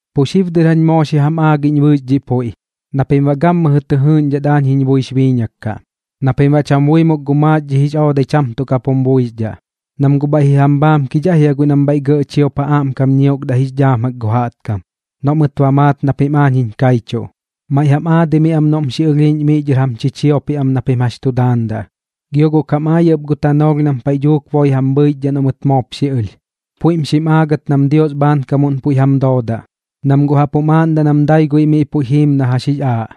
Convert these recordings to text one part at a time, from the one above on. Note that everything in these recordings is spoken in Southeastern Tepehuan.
’Pu xib dɨr jañ moo xi jam aagiꞌñ bɨɨx dhiꞌ puiꞌ na pim baꞌ gammɨjɨ tɨ jɨɨꞌñdhat aañ jiñ buix biiñak kaꞌ, na pim baꞌ cham buimuk gu maaxdhi jix oodai cham tuꞌ kap jum buixdhaꞌ. Nam guꞌ bhaiꞌ ji jam bhaamkidhaꞌ jia guiꞌ nam bhaiꞌ gɇꞌ chiop ja aꞌmkam ñiokdaꞌ jix dhaam gu jaꞌtkam, noꞌ mɨt ba maat na pim aañ jiñ kaichuꞌ. Maiꞌ jam aadimiaꞌ am noꞌm xi ɨlhiiꞌñ miꞌ dhɨr jam chichiopiꞌ am na pim jax tu daandaꞌ. Gio guꞌ kam aayaꞌ ɨp gu tanoolh nam paiꞌ dhuuk boi jam bhɨichdhaꞌ noꞌ mɨt moop xi ɨlh, puiꞌm xim aagat nam Dios bhaankamuꞌn puiꞌ jam doodaꞌ, nam guꞌ jaꞌp jum aaꞌndaꞌ nam dai guiꞌ miꞌ puiꞌ jiim na jax jix aaꞌ,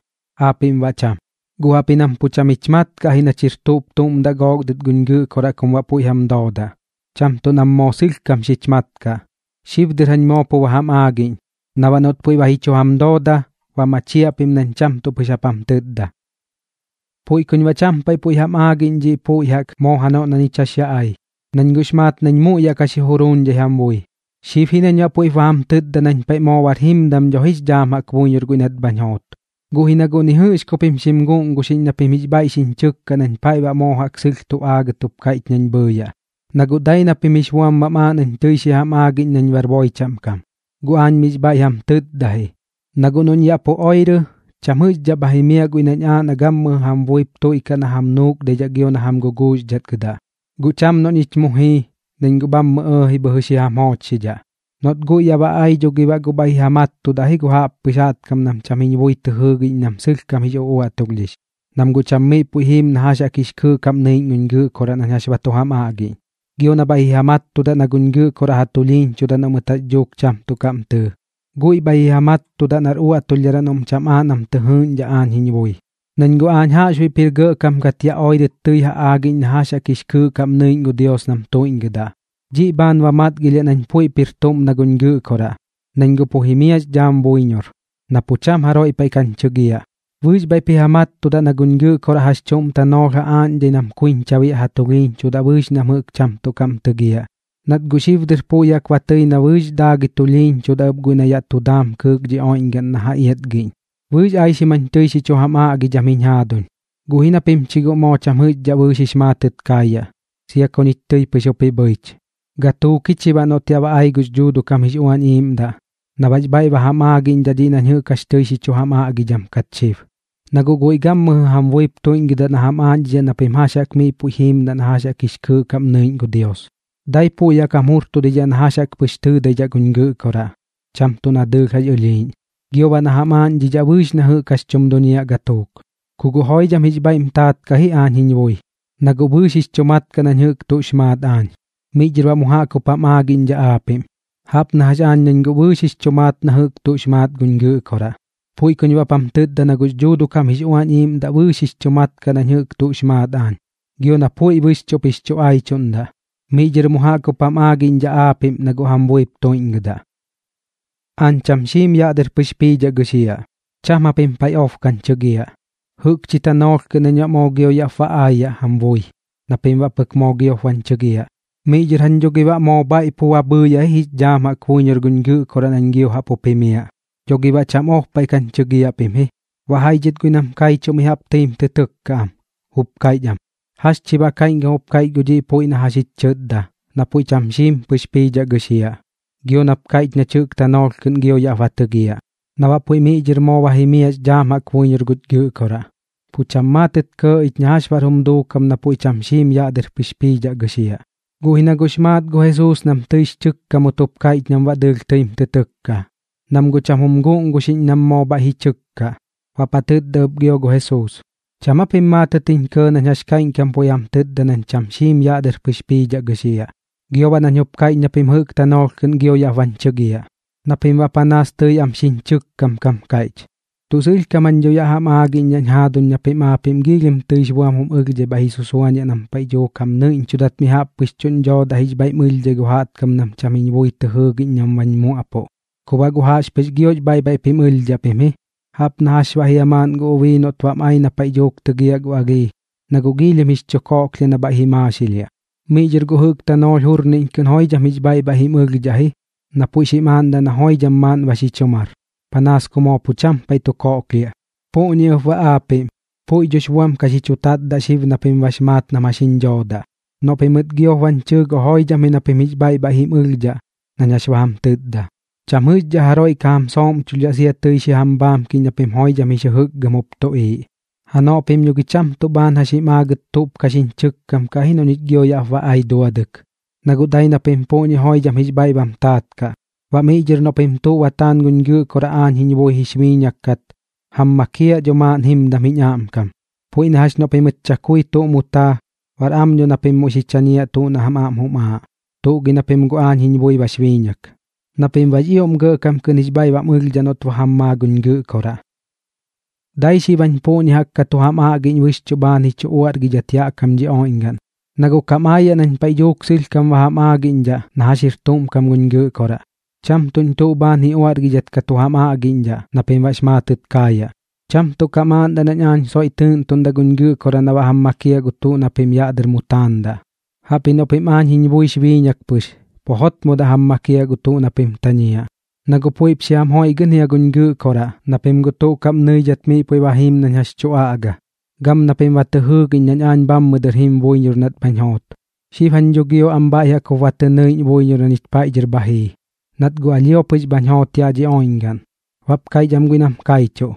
aapiꞌm baꞌ cham. Guꞌ jaꞌpji nam pu cham jich mat kaꞌ ji nach jir tuꞌp tuꞌm daꞌ gook dɨt guñ Gɨꞌkoraꞌ kum baꞌ puiꞌ jam doodaꞌ, cham tuꞌ nam moo sɨlhkam xich mat kaꞌ. Xib dɨr jañ moo pu ba jam aagiꞌñ, na baꞌ noꞌt puiꞌ ba ji chu jam dooda, ba machiaꞌ pim nañ cham tuꞌ pɨx jap jam tɨtda. ’Puiꞌ kuñ baꞌ cham paiꞌ puiꞌ jam aagiꞌñ dhiꞌ puiꞌ jaꞌk moo janoꞌ na ñich jax yaꞌ ai, nañ guꞌx maat nañ muiꞌ yaꞌ ka xi juruuñdhai jam bui. Xib ji nañ baꞌ puiꞌp ba jam tɨtda nañ paiꞌ moo bar jimdam dho ji jix dhaam buiñor guiꞌ nat bhañ joot. Guꞌ ji na guꞌ ni jɨꞌx ku pim xim guguuxiꞌñ na pim jix bhaiꞌ xiñ chɨkkaꞌ nañ paiꞌ baꞌ moo jaꞌk sɨlh tu aagɨt jup kaiꞌch nañ bhɨɨyaꞌ, na guꞌ dai na pim jix buam bam aaꞌ nañ tɨi xi jam aagiꞌñ nañ bar boi chaꞌm kam. Guꞌ aañ miꞌx bhaiꞌ jam tɨtda ji. Na guꞌ noꞌñ yaꞌ pu oirɨ, cham jɨꞌxdhaꞌ bha jimiaꞌ guiꞌ nañ aaꞌ na gammɨjɨ jam buip tuiꞌkaꞌ na jam nuukdaidhaꞌ gio na jam guguuxdhatgɨdaꞌ. Guꞌ cham noꞌ ñich mu jii, nañ guꞌ bhammɨ ɇɇji bhɨjɨ xi jam joochxidhaꞌ. Noꞌt guiꞌ yaꞌ ba ai dho gi baꞌ guꞌ bhaiꞌ ji ja mattudaꞌ ji gu jaꞌppɨx jaꞌtkam nam cham jiñ bui tɨ jɨɨgiꞌñ nam sɨlhkam jix uꞌuaꞌtulhdhix, nam guꞌ cham miꞌ puiꞌ jiim na jax jaꞌk jix kɨɨꞌ kaꞌm nɨiꞌñ guñ Gɨꞌkoraꞌ nañ jax ba tu ja aꞌgiꞌñ, gio na bhaiꞌ ji ja mattudaꞌ na guñ Gɨꞌkoraꞌ ja tulhiiñchudaꞌ noꞌ mɨt jax dhuuk cham tuꞌ kaꞌm tɨɨ. Guiꞌ bhai ji ja mattudaꞌ nar uaꞌtulhdharaꞌ noꞌm cham aaꞌ nam tɨ jɨɨꞌñdhaꞌ aañ jiñ bui. Nañ guꞌ aañ jaꞌxbuiꞌp jir gɇꞌkam kat yaꞌ oirɨt tɨi tu ja aꞌgiꞌñ na jax jaꞌk jix kɨɨꞌ kaꞌm nɨiꞌñ gu Dios nam tuiꞌñgɨdaꞌ. Dhiꞌ bhaan ba matgilhiaꞌ nañ puiꞌp jir tuꞌm na guñ Gɨꞌkoraꞌ, nañ guꞌ pu jimiaꞌx dhaam buiñor, na pu cham jaroiꞌ paiꞌ kañ chɨgiaꞌ. Bɨɨx bhaiꞌp ji ja mattudaꞌ na guñ Gɨꞌkoraꞌ jax chuꞌm tanoolh ja aaꞌñdhai nam kuiñcha biaꞌ ja tulhiiñchudaꞌ bɨɨx nam jɨꞌk cham tuꞌ kaꞌm tɨgiaꞌ, nat guꞌ xib dɨr puiꞌ jaꞌk ba tɨi na bɨɨx daagɨi tulhiiñchudaꞌ ɨp guiꞌ na yaꞌ tu daam kɨɨk dhi oiꞌñgaꞌn na ja iatgiꞌñ. ’Bɨɨx aixim jañ tɨi xi chu jam aꞌgidham jiñ jaaduñ, guꞌ ji na pim chi guꞌ moo cham jɨꞌxdhaꞌ bɨɨx jix maatɨt kaayaꞌ, sia ku ñich tɨi pɨx jup ji bhɨich. Gatuuk ji chi baꞌ noꞌt yaꞌ ba ai gux Dhuuduꞌ kam jix Uañ Iiꞌmdaꞌ na baꞌx bhaiꞌ ba jam aagiꞌñdhaꞌ dhiꞌ nañ jɨꞌk jax tɨi xi chu jam aꞌgidham kat xib. Na guꞌ guiꞌ gammɨjɨ jam buip tuiꞌñgɨda na jam aaꞌñdhidhaꞌ na pim jax jaꞌk miꞌ puiꞌ jiimdaꞌ na jax jaꞌk jix kɨɨꞌ kaꞌm nɨiꞌñ gu Dios. Daipuꞌ puiꞌ jam jurtudidhaꞌ na jax pɨx tɨɨdaidhaꞌ guñ Gɨꞌkoraꞌ, cham tuꞌ na dɨɨlh jax ɨlhiiꞌñ, gio baꞌ na ba jam aagiꞌñdhaꞌ bɨɨx na jɨꞌk jax tum duñiaꞌ gatuuk. Ku guꞌ joidham jix bhaiꞌm taat kaꞌ ji aañ jiñ bui, na guꞌ bɨɨx jix chu mat kaꞌ nañ jɨꞌk tuꞌx maat aañ, miꞌ dhɨr baꞌ mu jaꞌk jup jam aagiꞌñdhaꞌ aapiꞌm. Jaꞌp na jax aañ nañ guꞌ bɨɨx jix chu maat na jɨꞌk tuꞌx maat guñ Gɨꞌkoraꞌ, puiꞌ kuñ baꞌp jam tɨtda na gux Dhuuduꞌ kam jix Uañ Iiꞌmdaꞌ bɨɨx jix chu mat kaꞌ nañ jɨꞌk tuꞌx maat aañ, gio na puiꞌ bɨxchuꞌp jix chu aichuꞌndaꞌ. Miꞌ dhɨr mu jaꞌk jup jam aaꞌñdhidhaꞌ aapiꞌm na guꞌ jam buip tuiꞌñgɨdaꞌ. ’Aañ cham xiim yaꞌ dɨr pɨx piidhaꞌ gɨxiaꞌ, cham japim paiꞌ ob kañ chɨgiaꞌ. Jɨꞌkchi tanoolh kɨꞌn nañ baꞌ moo gio yaꞌp ba aayaꞌ jam bui na pim baꞌ pɨk moo giop bañ chɨgiaꞌ. Miꞌ dhɨr jañ dho gi baꞌ moo bhaiꞌ pu ba bhɨɨyaꞌ ji jix dhaam jaꞌk buiñor guñ Gɨꞌkoraꞌ nañ gio jaꞌp jup jimiaꞌ, dho gi baꞌ cham ob kañ chɨgiaꞌ pim ji. Baꞌ jaiꞌ dhɨt guiꞌ nam kaichuꞌ mi jaꞌp tɨim tɨ tɨkkaꞌ am, jup kaiꞌch am: ―¿Jax chi baꞌ kaiꞌñkam jup kaiꞌch gu dhiꞌ puiꞌ na jɨꞌk jax jich chɨtda, na puiꞌ cham xiim pɨx piidhaꞌ gɨxiaꞌ, gio nap kaiꞌch nach jɨꞌk tanoolh kɨꞌn gio yaꞌp ba tɨgiaꞌ, na baꞌ puiꞌ miꞌ dhɨr moo ba jimiaꞌx dhaam buiñor guch Gɨꞌkoraꞌ? Pu cham maatɨt kɇɇ ich na jax baꞌr jum duukam na puiꞌ cham xiim yaꞌ dɨr pɨx piidhaꞌ gɨxiaꞌ. Guꞌ ji na guꞌx maat gu Jesuus nam tɨix chɨkkamut jup kaiꞌch nam baꞌ dɨɨlh tɨim tɨ tɨkka, nam guꞌ cham jum guguuxiꞌñ nam moo bhaiꞌ ji chɨkkaꞌ. Baꞌp ja tɨtda ɨp gio gu Jesuus: ―¿Cham aa pim maatɨt jiñ kɇɇ nañ jax kaiꞌñkam puiꞌ jam tɨtda nañ cham xiim yaꞌ dɨr pɨx piidhaꞌ gɨxiaꞌ, gio baꞌ nañ jup kaiꞌch na pim jɨꞌk tanoolh kɨꞌn gio yaꞌp bañ chigiaꞌ? Na pim baꞌ panaas tɨi am xiñ chɨkkam kam kaiꞌch. Tuꞌ sɨlhkam jañ dho yaꞌ jam aagiꞌñdhaꞌñ jaaduñ na pim aapiꞌm giilhim tɨix buam jum ɨlhdhai bhaiꞌ ji susuañiaꞌ nam paiꞌ dhuuk jam nɨiꞌñchudat mi jaꞌp pɨx tuꞌñ dhoodaꞌ jix bhaiꞌm ɨlhdai gu jaꞌtkam nam cham jiñ bui tɨ jɨɨgiꞌñ nam bañ muaꞌpuꞌ. Ku baꞌ guꞌ jaꞌxpɨx giox bhaiꞌ bhaiꞌp jim ɨlhdhaꞌ pim ji. Jaꞌp na jax baꞌ jia maaꞌn gu ubii noꞌt bam ai na paiꞌ dhuuk tɨgiaꞌ gu alhii, na guꞌ giilhim jix chu koꞌklhiaꞌ na bhaiꞌ ji maaxilhiaꞌ. Miꞌ dhɨr guꞌ jɨꞌk tanoolh jurniꞌñ kɨꞌn joidham jix bhaiꞌ bhaiꞌ jim ɨlhdhaꞌ ji na puiꞌ xim aaꞌndaꞌ na joidham maaꞌn ba xi chu mar, panaas ku moo pu cham paiꞌ tu koꞌklhiaꞌ. Puꞌñi ɨp baꞌ aapiꞌm, puiꞌ dhox buam ka xi chu tatdaꞌ xib na pim bax maat nam jax jiñ dhoodaꞌ. Noꞌ pimɨt giop bañ chɨɨ guꞌ joidham ji na pim jix bhaiꞌ bhaiꞌ jim ɨlhdhaꞌ nañ jax ba jam tɨtda. Cham jɨꞌxdhaꞌ jaroiꞌ ka jam sooꞌmchuldhaꞌ sia chi tɨi xi jam bhaamkiꞌñ na pim joidham jix jɨjɨkgɨm jup tuꞌiiꞌ. ’Janoꞌ pim dho gi cham tuꞌ bhaan jax jim aagɨt tuꞌp ka xiñ chɨkkam kaꞌ ji noꞌ ñich gio yaꞌp ba ai duadɨk, na guꞌ dai na pim puꞌñi joidham jix bhaiꞌ bam taat kaꞌ. Baꞌ miꞌ dhɨr noꞌ pim tuꞌ ba taan guñ Gɨꞌkoraꞌ aañ jiñ buix biiñak kat, jam makiaꞌ dho maaꞌn jimdam jiñ aꞌmkam. Puiꞌ na jax noꞌ pimɨt chakui tuꞌ mu taa, bar am dho na pim muiꞌ xi chañiaꞌ gu tuꞌ na jam aꞌm jum aaꞌ. Tuꞌ gi na pim guꞌ aañ jiñ bui bax biiñak, na pim baꞌx ioꞌm gɇꞌkam kɨꞌn jix bhaiꞌ bam ɨlhdhaꞌ noꞌt ba jam maa guñ Gɨꞌkoraꞌ. ’Dai xib jañ puꞌñi jaꞌk ka tu jam aꞌgiꞌñ bɨxchuꞌ bhaan ji chu uaꞌrgidhat yaꞌ kam dhi oiꞌñgaꞌn, na guꞌ kam aayaꞌ nañ paiꞌ dhuuk sɨlhkam ba jam aagiꞌñdhaꞌ na jax jir tuꞌm kam guñ Gɨꞌkoraꞌ, cham tuꞌñ tuꞌ bhaan ji uaꞌrgidhat ka tu jam aꞌgiꞌñdhaꞌ na pim baꞌx maatɨt kaayaꞌ. Cham tuꞌ kam aaꞌndaꞌ nañ aañ soiꞌ tɨɨꞌntuꞌndaꞌ guñ Gɨꞌkoraꞌ na baꞌ jam makiaꞌ gu tuꞌ na pim yaꞌ dɨr mu taandaꞌ, jaꞌpji noꞌ pim aañ jiñ buix biiñak pɨx, pu jotmodaꞌ jam makiaꞌ gu tuꞌ na pim tañiaꞌ. Na guꞌ puiꞌp xi jam joiꞌgɨꞌn jia guñ Gɨꞌkoraꞌ, na pim guꞌ tuꞌ kaꞌm jiñ ñɨidhat miꞌ puiꞌ ba jiim nañ jax tu aꞌga, gam na pim ba tɨ jɨɨgiꞌñ nañ aañ bhammɨ dɨr jim buiñor nat bhañ joot. Xib jañ dho gio am bhaiꞌ jaꞌk jup ba tɨ nɨiꞌñ buiñor na ñich paiꞌ dhɨr bha jii, nat guꞌ alhio pɨx bhañ joot yaꞌ dhi oiꞌñgaꞌn. Baꞌp kaiꞌch am guiꞌ nam kaichuꞌ: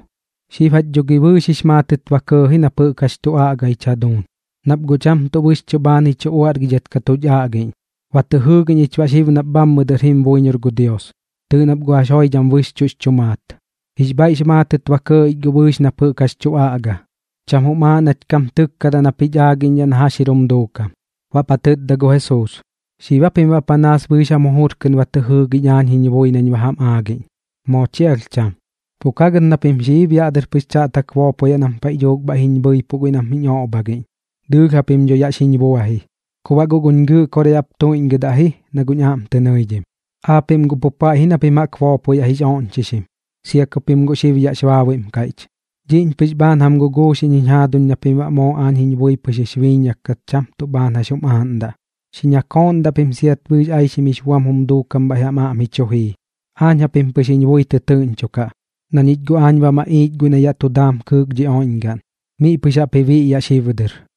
―Xib jach dho gi bɨɨx jix maatɨt kɇɇ ji nap jɨꞌk jax tu aꞌga jiñ jaduuñ, nap guꞌ cham tuꞌ bɨxchuꞌ bhaan ji chu uaꞌrgidhat ka tuch aꞌgiꞌñ. Ba tɨ jɨɨgiꞌñ ich baꞌ xib nap bhammɨ dɨr jim buiñor gu Dios. Tɨɨꞌ nap guꞌ jax joidham bɨxchuꞌx chu maat. Jix bhaiꞌx maatɨt ba kɇɇ ich guꞌ bɨɨx nap jɨꞌk jax tu aꞌga. Cham jum aaꞌ nach kam tɨkkadaꞌ nap jich aagiꞌñdhaꞌ na jax jir jum duukam. Baꞌp ja tɨtda gu Jesuus: ―¿Xib aa pim baꞌ panaas bɨɨx jam jujur kɨꞌn ba tɨ jɨɨgiꞌñ aañ jiñ bui nañ ba jam aagiꞌñ? Moo chi alh cham. Pu ka gɨt na pim xiib yaꞌ dɨr pɨx chaꞌtak boopoyaꞌ nam paiꞌ dhuuk bhaiꞌ jiñ bhɨipuꞌ guiꞌ nam jiñ oꞌbhagiꞌñ, dɨɨlh japim dho yaꞌ xiñ bua ji. Ku baꞌ guꞌ guñ Gɨꞌkoraꞌ yaꞌp tuiꞌñgɨdaꞌ ji na guꞌñ aꞌm tɨ nɨidhim, aapiꞌm guꞌ pu paiꞌ ji na pim jaꞌk boopoyaꞌ jix oꞌñchixim, sia ku pim guꞌ xib yaꞌx baabuiꞌm kaiꞌch. Dhiꞌñ pɨx bhaan jam guguuxiꞌñ jiñ jaaduñ na pim baꞌ moo aañ jiñ bui pɨx jix biiñak kat cham tuꞌ bhaan jax jum aaꞌndaꞌ. Xi ñakooꞌndaꞌ pim siat bɨɨx aixim jix buam jum duukam bhaiꞌ jam aꞌm ji chu jii. Aañ japim pɨx jiñ bui tɨtɨɨꞌñchokaꞌ, na ñich guꞌ aañ ba maꞌiich guiꞌ na yaꞌ tu daam kɨɨk dhi oiꞌñgaꞌn, miꞌ pɨx jaꞌp ji biꞌyaꞌ xib dɨr.